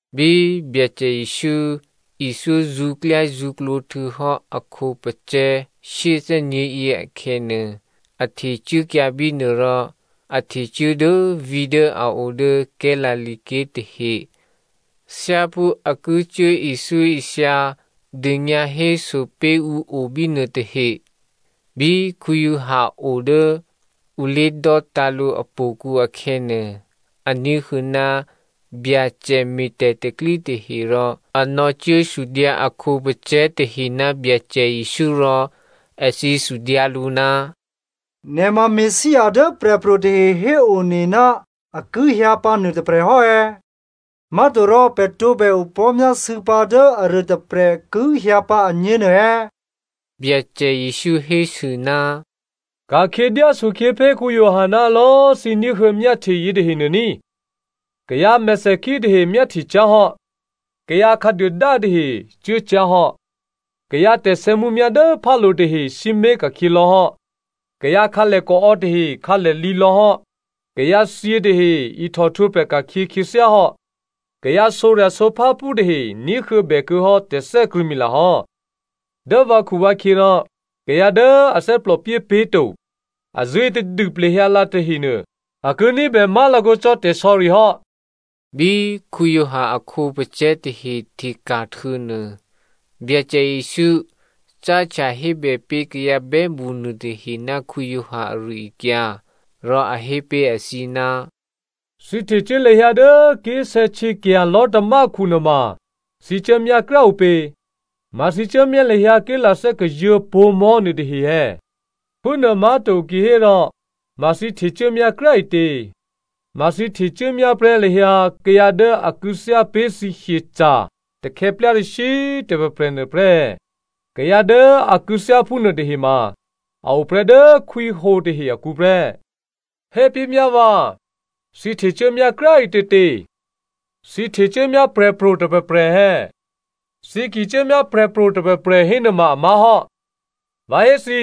Bí Byacè Jesǔ ithyó zṳ̌klyázṳ̌klǒ htuô̌hò́ a khǒpacè̤̌ shyéthè́nyě̤yě akhè̌nuô, a htecuốkyǎ bínuô rò a htecuố dố vǐ̤ dố a o dố Galilea ké̤ tahe thyáphú a ki cuố ithyóithya dônyǎhéso pé̤ ǔ obínuô tahe. Bí Giovanni o dố ǔ lé̤dò́tǎ̤ lǔ htò̌kǔ akhè̌nuô, a ní̤huô̌ ná Byacè me̤ tè̤pro̤tè̤prya̤ tahe rò a nò̌cuốsudyǎ a khǒpacè̤̌ tahe ná Byacè Jesǔ rò èthǐ sudyǎ lǔ, “Nè̤ ma Messia dố prè̤pro̤ tahe héone ná a ki hyǎ pǎ nuôtôprè̤ hò́ è̌? Má̤torò pè̤ tǒbè opò̤́myásû̌pǎ dố aruôtôprè̤ ki hyǎ pǎ agně nuô è̌?” Byacè Jesǔ hésû, “Ka̤khyě dyásokhyě pé̤ Giovanni ná lò̌꤮ thǐ ní̤huô̌ myáhtye yětahenuô ní꤮. Kayǎ mèthèkhí tahe myáhtye cyá̤hò́, kayǎ khǎduôdá tahe cuốcyá̤hò́, kayǎ tè̤sè̌mǔmyá̤ dố phálo̤ tahe sǐmé̤ ka̤khyě lò̌hò́, kayǎ khǎlèkaò̌ tahe khǎlèlǐ lò̌hò́, kayǎthyě tahe ihtòhtwǒprè̤ ka̤khyě khyěthyáhò́, kayǎ sǒrya̤sǒpháphú tahe ní̤huô̌bè kuô̌hò́ tè̤thè́krṳ̂̌mila hò́. Dố vǎkhuvǎkhyě rò kayǎ dố a thè́plòpyé pé̤to, a zṳ̂́e tadû plehyǎlǎ tahenuô a ki ní̤bè má̤lakǒ cò́ tè̤sò̌ri hò́.” Bí Giovanni a khǒpacè̤̌ tahe hteka̤ htuô̌nuô, Byacè Jesǔ cáhtya hébè pé̤ kayǎ bè́mṳ nuôtahe ná Giovanni ari-akyǎ. Rò a hé pé̤ èthǐ, “Thǐ htecuố lahyǎ dố ké̤sè̌htyěkya̤ lò̤́tamákhu nuôma, thǐ cuốmyá kryá꤮ ǔpě? Ma thǐ cuốmyá lahyǎ ké̤lathè́ kazuô̤̌ pǒ̤mò̤́ nuôtahe è̌? Phúnuô má̤to kihérò, ma thǐ htecuốmyá kryá꤮ ǐtě? Ma thǐ htecuốmyá prè́ lahyǎ kayǎ dố a kû̌thyá pé̤ thǐ hyeca̤ takhè̌plyarashyǐ tôprè̤prè̤ nuôprè́ è̌? Kayǎ dố a kû̌thyá phúnuô tahe ma a oprè́ dố khwíhǒ tahe akǔ prè́. Hépé̤myá vǎ, thǐ htecuốmyá kryá꤮ ǐtětě? Thǐ htecuốmyá prè̤pro̤ tôprè̤prè̤ è̌? Thǐ ki cuốmyá prè̤pro̤ tôprè̤prè̤ hénuôma a má̤hò́. Vǎ hé thǐ,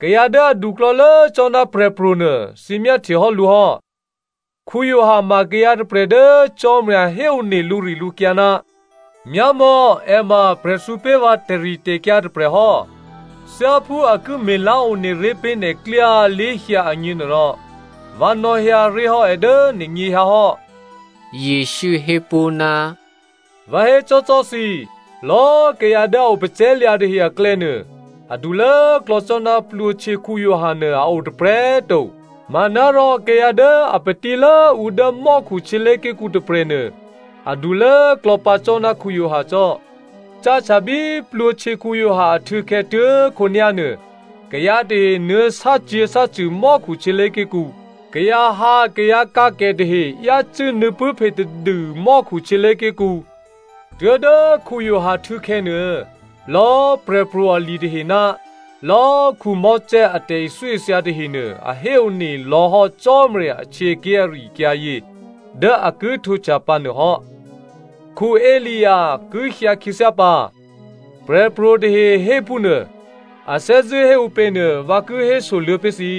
kayǎ dố aduklò̌lố cò́ ná prè̤pro̤nuô, thǐ myáhtye hò́ lǔ hò́. Giovanni ma kayǎ tôprè̤ dố Cò́marya héone lǔrilǔkyǎ, ‘Myámò̌ è ma prè̤thǔ pé̤ vǎ tè̤ritè̤kyǎ tôprè̤hò́, thyáphú a ki me̤lá̤ one ré̤ pé̤ nè̤klyá lé̤hyǎ agněnuôrò, vǎ nò̌hyǎ ré̤hò́ è dố nè̤nyěhyǎ hò́.’” Jesǔ hé pó̤, “Vǎ hécò́cò́ thǐ, lò̌꤮ kayǎ dố a opacè̤̌lya̤ tahe aklè̌nuô, adulốklò̌ cò́ ná Giovanni Baptista nuô a o tôprè̤꤮ to. Manárò kayǎ dố a patílốǔ dố mò́khu htyělé̤ké̤kǔ tôprè̤nuô, adulốklò̌ pǎ cò́ ná Giovanni cò́. Cáhtya bí Giovanni Baptista ahtû̌khè̌ tuố̤khǒnyá̤nuô, kayǎ tahe nuô̌ sácyě̤sácṳ̂ mò́khu htyělé̤ké̤kǔ. Kayǎhǎkayǎkǎkè tahe yácû́ nuô̌pṳ̂́phe tadû mò́khu htyělé̤ké̤kǔ. Tuố̤dố Giovanni htû̌khè̌ nuô, lò̌꤮ prè̤pro̤ ali tahe ná lò̌꤮ Mosè a tè̤ithyóithya tahenuô a héone lò̌hò́ Cò́marya ahtyěké̤ ari-akyǎyě dố a ki htwǒhtya pǎ nuô hò́. Elia ki hyǎ khyěthyá pǎ, prè̤pro̤ tahe hé phúnuô. A thè́zṳ̂́ hé ǔpě nuô vǎ ki hésoluô̌ pé̤ thǐ.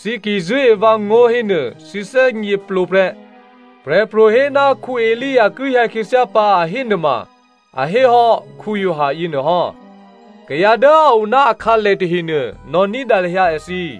Thǐ ki zṳ̂́e vǎngó̤ hénuô thǐ thè́gněplǒ prè́. Prè̤pro̤ hé ná Elia ki hyǎ khyěthyá pǎ, a hé nuôma, a hé hò́ Giovanni yěnuôhò́. Kayǎ dố a o ná akhǎlè tahenuô, nò̌ ní̤dǎ lahyǎ èthǐ.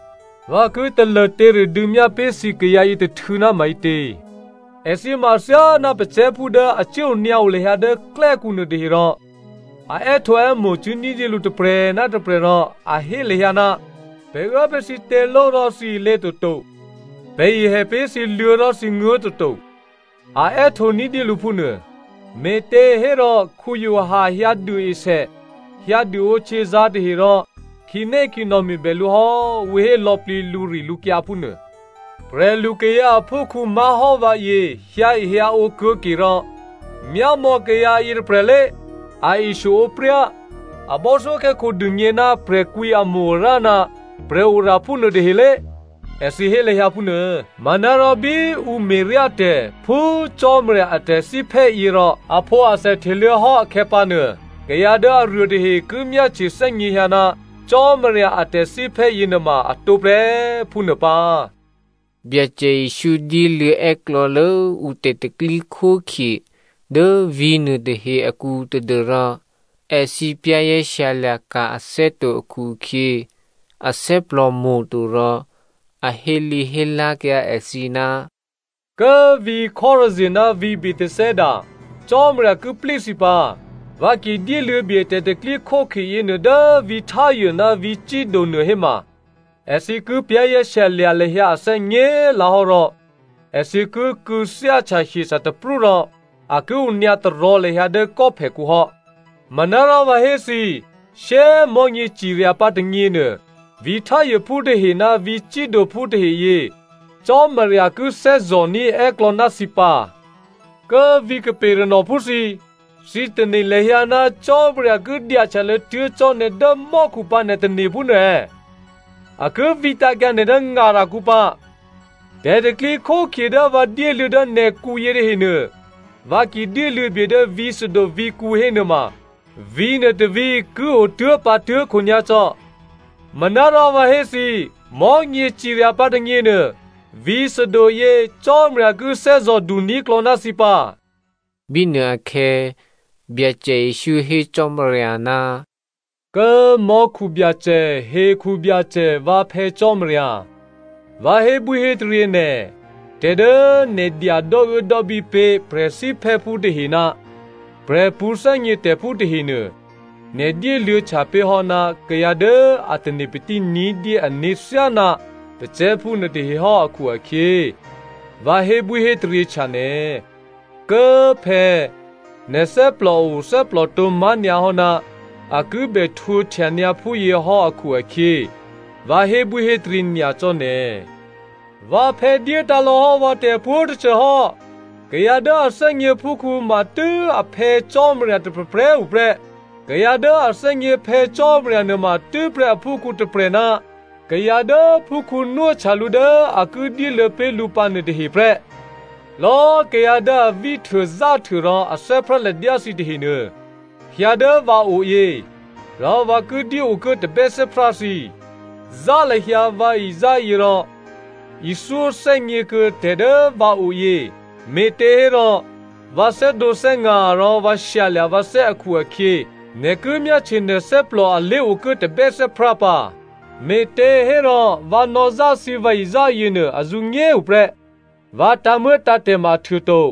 “Vǎ ki talô těradû̌myá pé̤ thǐ kayǎ yětôhtû̌ ná maǐtě? Èthǐ ma athyáná pacè̤̌phú dố a cuố onyǎo lahyǎ dố klè́kǔ nuôtahe rò a è́htǒè́mo̤ cuố ní̤dyé lǔ tôprè̤ ná tôprè̤ rò a hé lahyǎ, ‘Pè̤ uố pé̤ thǐ těló rò thǐ ilě toto, pè̤ ihè pé̤ thǐ luô̤̌ rò, thǐ nguố̤ toto,’ a è́htǒ ní̤dyé lǔ phúnuô. “Me̤těhérò Giovanni hyǎ duôesè, hyǎ duôǒhtyězǎ̤ tahe rò ‘Khǐnékhǐnò̌ me̤bè lǔ hò́,’ ǔ hé lò̌plǐ lǔrilǔkyǎ phúnuô. Prè̤lukayǎ aphúkhǔ má̤hò́ vǎyě hyǎehyǎǒ kuô̌ke rò ‘Myámò̌ kayǎ yětôprè̤lé, a eshyoǒpryá, a bò́thyókhè́khǒ dûgně ná prè̤kwǐamo-arǎ ná prè̤oraphú nuôtahelé꤮,’ èthǐ hé lahyǎ phúnuô. Manárò bí ǔ me̤ryá tè̤ phú Cò́marya a tè̤thíphè́ yěrò aphǒathè hteluô̌hò́ akhè̌pǎnuô, kayǎ dố aruô tahe ki myáhtye thè́gněhyǎ ná Cò́marya a tè̤thíphè́ yěnuôma a tǒprè́, phúnuô pǎ.” Byacè Jesǔ dyéluô̌ è́klò̌lố ǔ tè̤pro̤tè̤prya̤ dố vǐ̤nuô tahe akǔ tadû́rò èthǐ za̤ ní̤dû kuô̌ǔ ané̤ to akhu-akhyě athè́plò mo̤to rò a hélǐhélá̤kyǎ èthǐ, “Kố꤮ vǐ̤ Chorazin ná vǐ̤ Bethsaida, Cò́marya ki plí thǐ pǎ. Vǎ ki dyéluô̌ bye tè̤pro̤tè̤prya̤ yěnuô dố vǐ̤ Tyre ná vǐ̤ Sido nuô héma, èthǐ ki za̤ ní̤dû lahyǎ ané̤ nyě̤꤮ lǎhò́ rò èthǐ ki kû̌thyáhtya hyeca̤ taprú rò a ki onyǎ tarò̤̌ lahyǎ dố kò́phèkhu hò́. Manárò vǎ hé thǐ, shyé꤮ mò̤́nyěcirya pǎ tônyěnuô, vǐ̤ Tyrephú tahe ná vǐ̤ Sidophú taheyě, Cò́marya ki thè́zò̤ní̤ è́klò̌ ná thǐ pǎ. Kố꤮ vǐ̤ Capernaumphú thǐ꤮, thǐ tane̤ lahyǎ ná Cò́marya ki dyahtyalô̌ tuố̤ cò́ nè̤ dố mò́khu pǎ nè̤ tane̤ phúnuô è̌? A ki vǐtǎ̤kyǎ nè̤ dố ngarakǔ pǎ. Tè̤pro̤tè̤prya̤ dố vǎ dyéluô̌ dố nè̤kǔ yětahenuô, vǎ ki dyéluô̌ bye dố vǐ̤ Sodom vǐ̤kǔ hénuôma vǐ̤nuô tôvǐ̤ ki o tuố̤pǎ tuố̤khǒnyá̤ cò́. Manárò vǎ hé thǐ, mò̤́nyěcirya pǎ tônyěnuô, vǐ̤ Sodomyě, Cò́marya ki thè́zò̤ duní̤klò̌ ná thǐ pǎ.” Bínuôakhè̌ Byacè Jesǔ hé Cò́marya, “Kố꤮ mò́khu Byacè, hekhu Byacè, vǎ Phè̌ Cò́marya꤮ vǎ hébwíhétaryě nè̤, tè̤ dố nè̤ dya dò́uốdò́bí pé̤ prè̤thíphè́phú tahe ná prè̤pṳ̌thè́gnětè̤phú tahenuô, nè̤ dyéluô̌htya pé̤hò́ ná kayǎ dố a tane̤patí ní̤dyé ané̤ thyáná pacè̤̌phú nuôtahehò́ akhu-akhyě, vǎ hébwíhétaryěhtya nè̤. Kố꤮ phè̌꤮, nè̤ thè́plòo thè́plòtǒ má̤nyǎhò́ ná a kibè htwǒhtyanyǎ phúyěhò́ akhu-akhyě, vǎ hébwíhétaryě nyacò́ nè̤. “Vǎphè̌ dyétǎ̤lò̌ hò́ vǎ tè̤pwǒ̤꤮ tôcô hò́. Kayǎ dố a thè́gně phúkhǔ matû́ a Phè̌ Cò́marya tôprè̤prè̤꤮ tuô̌ prè́. Kayǎ dố a thè́gně Phè̌ Cò́marya nuôma tû́prè́ aphúkhǔ tôprè̤ ná kayǎ dố phúkhǔ nwóhtya lǔ dố a ki dyéluô̌ pé̤ lǔ pǎ nuôtahe prè́. “Lò̌꤮ kayǎ dố a víhtuôzáhtuô rò a thè́prá ladyá thǐ tahenuô, hyǎ dố vǎoyě, rò vǎ ki dyéokuố tabè́thè́prá thǐ. Zá lahyǎ vǎ izáyě rò ithyóthè́gně kuô̌ tè̤ dố vǎoyě, me̤těhérò vǎ thè́dǒthè́nga̤ rò vǎ shyalya̤ vǎthè́ akhu-akhyě, nè̤ ki myáhtye nè̤ thè́plò a lé̤okuố tabè́thè́prá pǎ. Me̤těhérò vǎ nò̌zá thǐ vǎizá yěnuô, azǔnyé꤮ hu prè́. Vǎ tǎ̤muô̌tǎ̤tè̤ ma ahtuô to.”